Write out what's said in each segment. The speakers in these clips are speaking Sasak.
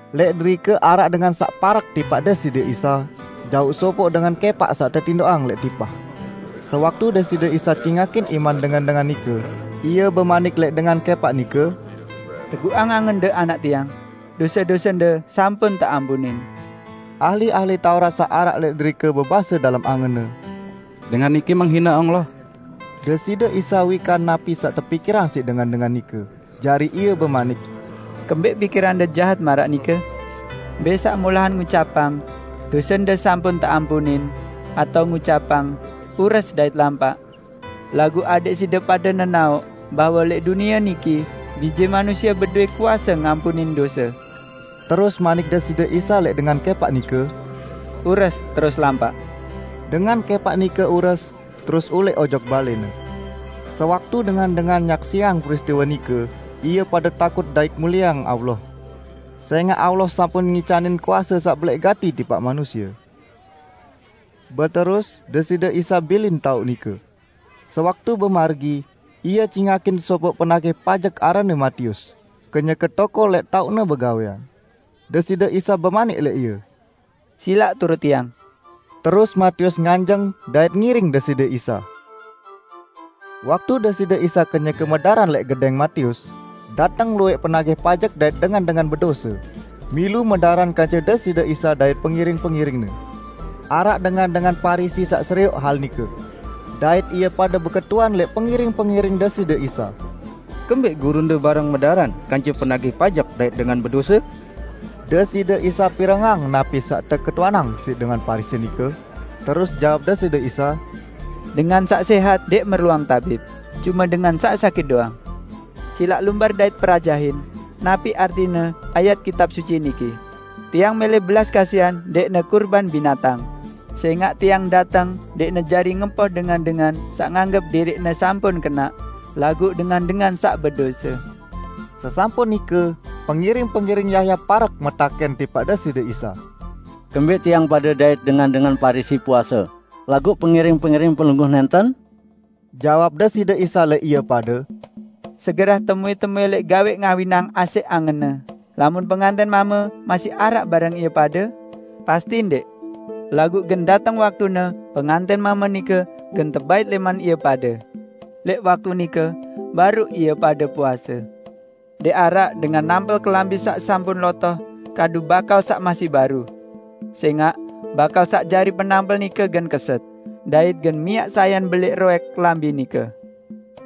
Lẽq derike araq dengan saq parek tipaq Deside Isa jauq sopoq dengan kẽpaq saq tetindoqang lẽq tipah. Sewaktu Deside Isa cingakin iman dengan-dengan nike, Ie bemanik lẽq dengan kẽpaq nike, "Teguqang angende, anak Tiang, dose-dosende sampun teampunin." Ahli-ahli Taurat saq araq lẽq derike bebase dalem angenne, "Dengan niki menghine Allah!" Deside Isa wikan napi saq tepikirang siq dengan-dengan nike, jari Ie bemanik, "Kembẽq pikirande jahat maraq nike? Mbẽ saq molahan ngucapang: 'Dosende sampun teampunin', atao ngucapang: 'Ures dait lampaq?' Laguq adẽq side pade nenaoq bahwe lẽq dunie niki Bije Manusie bedowẽ kuase ngampunin dose." Terus manik Deside Isa lẽq dengan kẽpaq nike, "Ures, terus lampaq!" Dengan kẽpaq nike ures, terus ulẽq ojok balẽne. Sewaktu dengan-dengan nyaksiang peristiwe nike ie pade takut dait mulieang Allah. Sẽngaq Allah sampun ngicanin kuase saq belẽq gati tipaq manusie. Beterus Deside Isa bilin taoq nike. Sewaktu bemargi, Ie cingakin sopoq penagih pajek aranne Matius, kenyeke tokol lẽq taoqne begawẽan. Deside Isa bemanik lẽq ie, "Silaq turut Tiang!" Terus Matius nganjeng dait ngiring Deside Isa. Waktu Deside Isa kenyeke medaran lẽq gedẽng Matius, dateng luwẽq penagih pajek dait dengan-dengan bedose, milu medaran kance Deside Isa dait pengiring-pengiring-Ne. Araq dengan-dengan Parisi saq serioq hal nike. Dait ie pade beketuan lẽq pengiring-pengiring Deside Isa, "Kembẽq gurunde bareng medaran kance penagih pajek dait dengan bedose?" Deside Isa pirengang napi saq teketuanang siq dengan Parisi nike, terus jawab Deside Isa, "Dengan saq sẽhat ndẽq merluang tabib, cume dengan saq sakit doang. Silaq lumbar dait perajahin napi artine ayat Kitab Suci niki: 'Tiang mẽlẽ belas kasihan, ndẽqne kurban binatang'. Sẽngaq Tiang dateng ndẽqne jari ngempoh dengan-dengan saq nganggep diriqne sampun kenaq, laguq dengan-dengan saq bedose." Sesampun nike, pengiring-pengiring Yahya parek metakẽn tipaq Deside Isa, "Kembẽq tiang pade dait dengan-dengan Parisi puase, laguq pengiring-pengiring Pelungguh nẽnten?" Jawab Deside Isa lẽq ie pade, "Segerah temuẽ-temuẽ lẽq gawẽ ngawinang asẽq angenne lamun pengantẽn mame masih araq bareng ie pade? Pasti ndẽq! Laguq gen dateng waktune pengantẽn mame nike gen tebait lẽman ie pade. Lẽq waktu nike baruq ie pade puase. Ndẽq araq dengan nampel kelambi saq sampun lotoh kadu bakal saq masih baru. Sẽngaq bakal saq jari penampel nike gen keset, dait gen miaq sayan belẽq roẽk kelambi nike.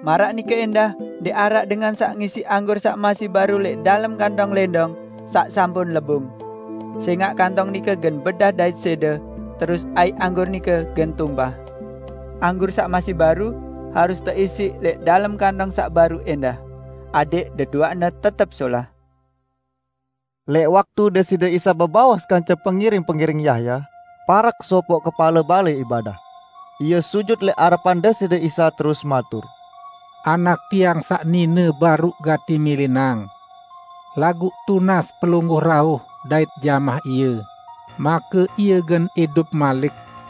Maraq nike ẽndah ndẽq araq dengan saq ngisiq anggur saq masih baru lẽq dalem kantong lẽndong saq sampun lebung. Sẽngaq kantong nike gen bedah dait sẽde, terus aiq anggur nike gen tumpah. Anggur saq masih baru harus teisiq lẽq dalem kantong saq baru ẽndah, adẽq deduaqne tetep solah." Lẽq waktu Deside Isa bebaos kance pengiring-pengiring Yahya, parek sopoq kepale balẽ ibadah. Ie sujut lẽq arepan Deside Isa terus matur, "Anak tiang saq nine baruq gati milinang. Laguq tunas Pelungguh rauh dait jamah ie, make ie gen idup malik."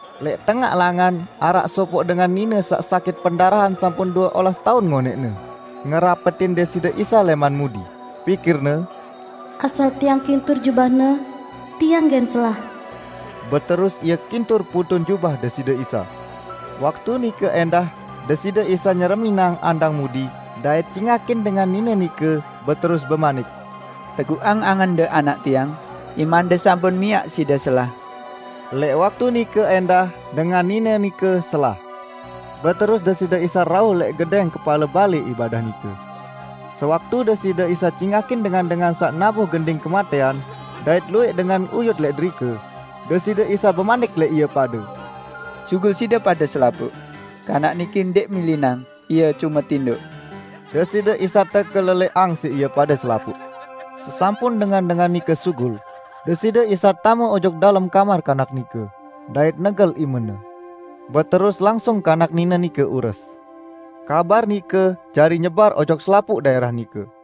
Lẽq tengaq langan araq sopoq dengan nine saq sakit pendarahan sampun due olas taun ngonẽqne, ngerapetin Deside Isa lẽman mudi. Pikirne, "Asal tiang kintur jubah-Ne, tiang gen selah." Beterus ie kintur poton jubah Deside Isa. Waktu nike ẽndah Deside Isa nyereminang andang mudi dait cingakin dengan nine nike beterus bemanik, "Teguqang angende, anak Tiang, imande sampun miaq side selah!" Lẽq waktu nike ẽndah dengan nine nike selah. Beterus Deside Isa rauh lẽq gedẽng kepale balẽ ibadah nike. Sewaktu Deside Isa cingakin dengan-dengan saq nabuh gending kematẽan dait luwẽq dengan uyut lẽq derike, Deside Isa bemanik lẽq ie pade, "Sugul side pade selapuq! Kanak niki ndẽq milinang, ie cume tindoq." Deside Isa tekelelẽqang siq ie pade selapuq. Sesampun dengan-dengan nike sugul, Deside Isa tame ojok dalem kamar kanak nike, dait negel imene. Beterus langsung kanak nine nike ures. Kabar nike jari nyebar ojok selapuq daẽrah nike.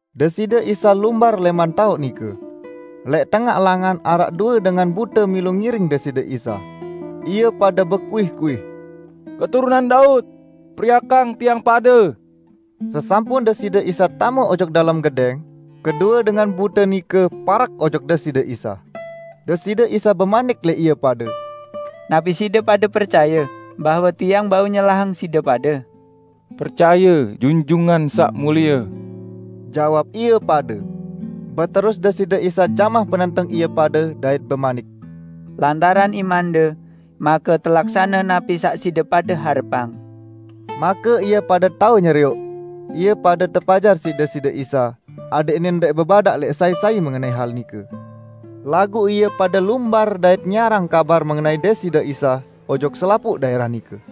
Deside Isa lumbar lẽman taoq nike. Lẽq tengaq langan araq due dengan bute milu ngiring Deside Isa. Ie pade bekuih-kuih, "Keturunan Daud! Periakang tiang pade!" Sesampun Deside Isa tame ojok dalem gedẽng, kedue dengan bute nike parek ojok Deside Isa. Deside Isa bemanik lẽq ie pade, "Napi side pade percaye bahwe Tiang bau nyelahang side pade?" "Percaye Junjungan Saq Mulie!" Jawab ie pade. Beterus Deside Isa jamah penenteng ie pade dait bemanik, "Lantaran imande, make telaksane napi saq side pade harepang." Make ie pade tao nyerioq. Ie pade tepajar siq Deside Isa adẽqne ndẽq bebadaq lẽq sai-sai mengenai hal nike. Laguq ie pade lumbar dait nyiarang kabar mengenai Deside Isa ojok selapuq daẽrah nike.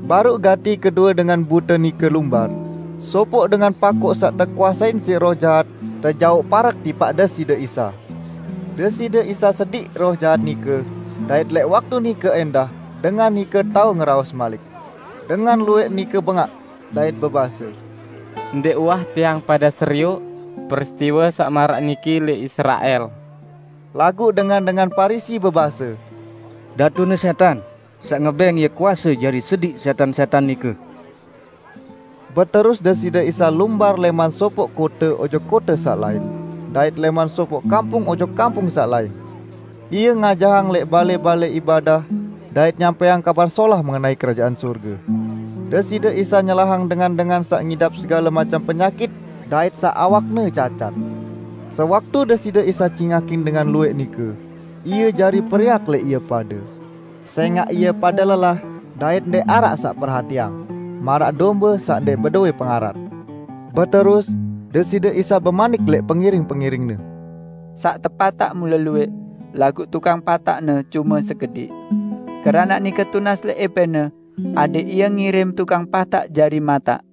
Baruq gati kedue dengan bute nike lumbar, sopoq dengan pakoq saq tekuasein siq roh jahat tejauq parek tipaq Deside Isa. Deside Isa sediq roh jahat nike dait lẽq waktu nike ẽndah dengan nike tao ngeraos malik. Dengan luwẽq nike bengaq, dait bebase, "Ndẽq uwah tiang pade serioq peristiwe saq maraq niki lẽq Israel!" Laguq dengan-dengan Parisi bebase, "Datune sẽtan saq ngebẽng Ie kuase jari sediq sẽtan-sẽtan nike." Beterus Deside Isa lumbar lẽman sopoq kote ojok kote saq lain dait lẽman sopoq kampung ojok kampung saq lain; Ie ngajahang lẽq balẽ-balẽ ibadah dait nyampẽang Kabar Solah mengenai Kerajaan Sorge. Deside Isa nyelahang dengan-dengan saq ngidap segale macem penyakit dait saq awakne cacat. Sewaktu Deside Isa cingakin dengan luwẽq nike, Ie jari periak lẽq ie pade, sẽngaq ie pade lelah dait ndẽq araq saq perhatiang, maraq dombe saq ndẽq bedowẽ pengarat. Beterus Deside Isa bemanik lẽq pengiring-pengiring-Ne, "Saq tepataq mule luwẽq, laguq tukang pataqne cume sekediq. Keranaq nike tunas lẽq ~Epẽne adẽq Ie ngirim tukang pataq jari mataq."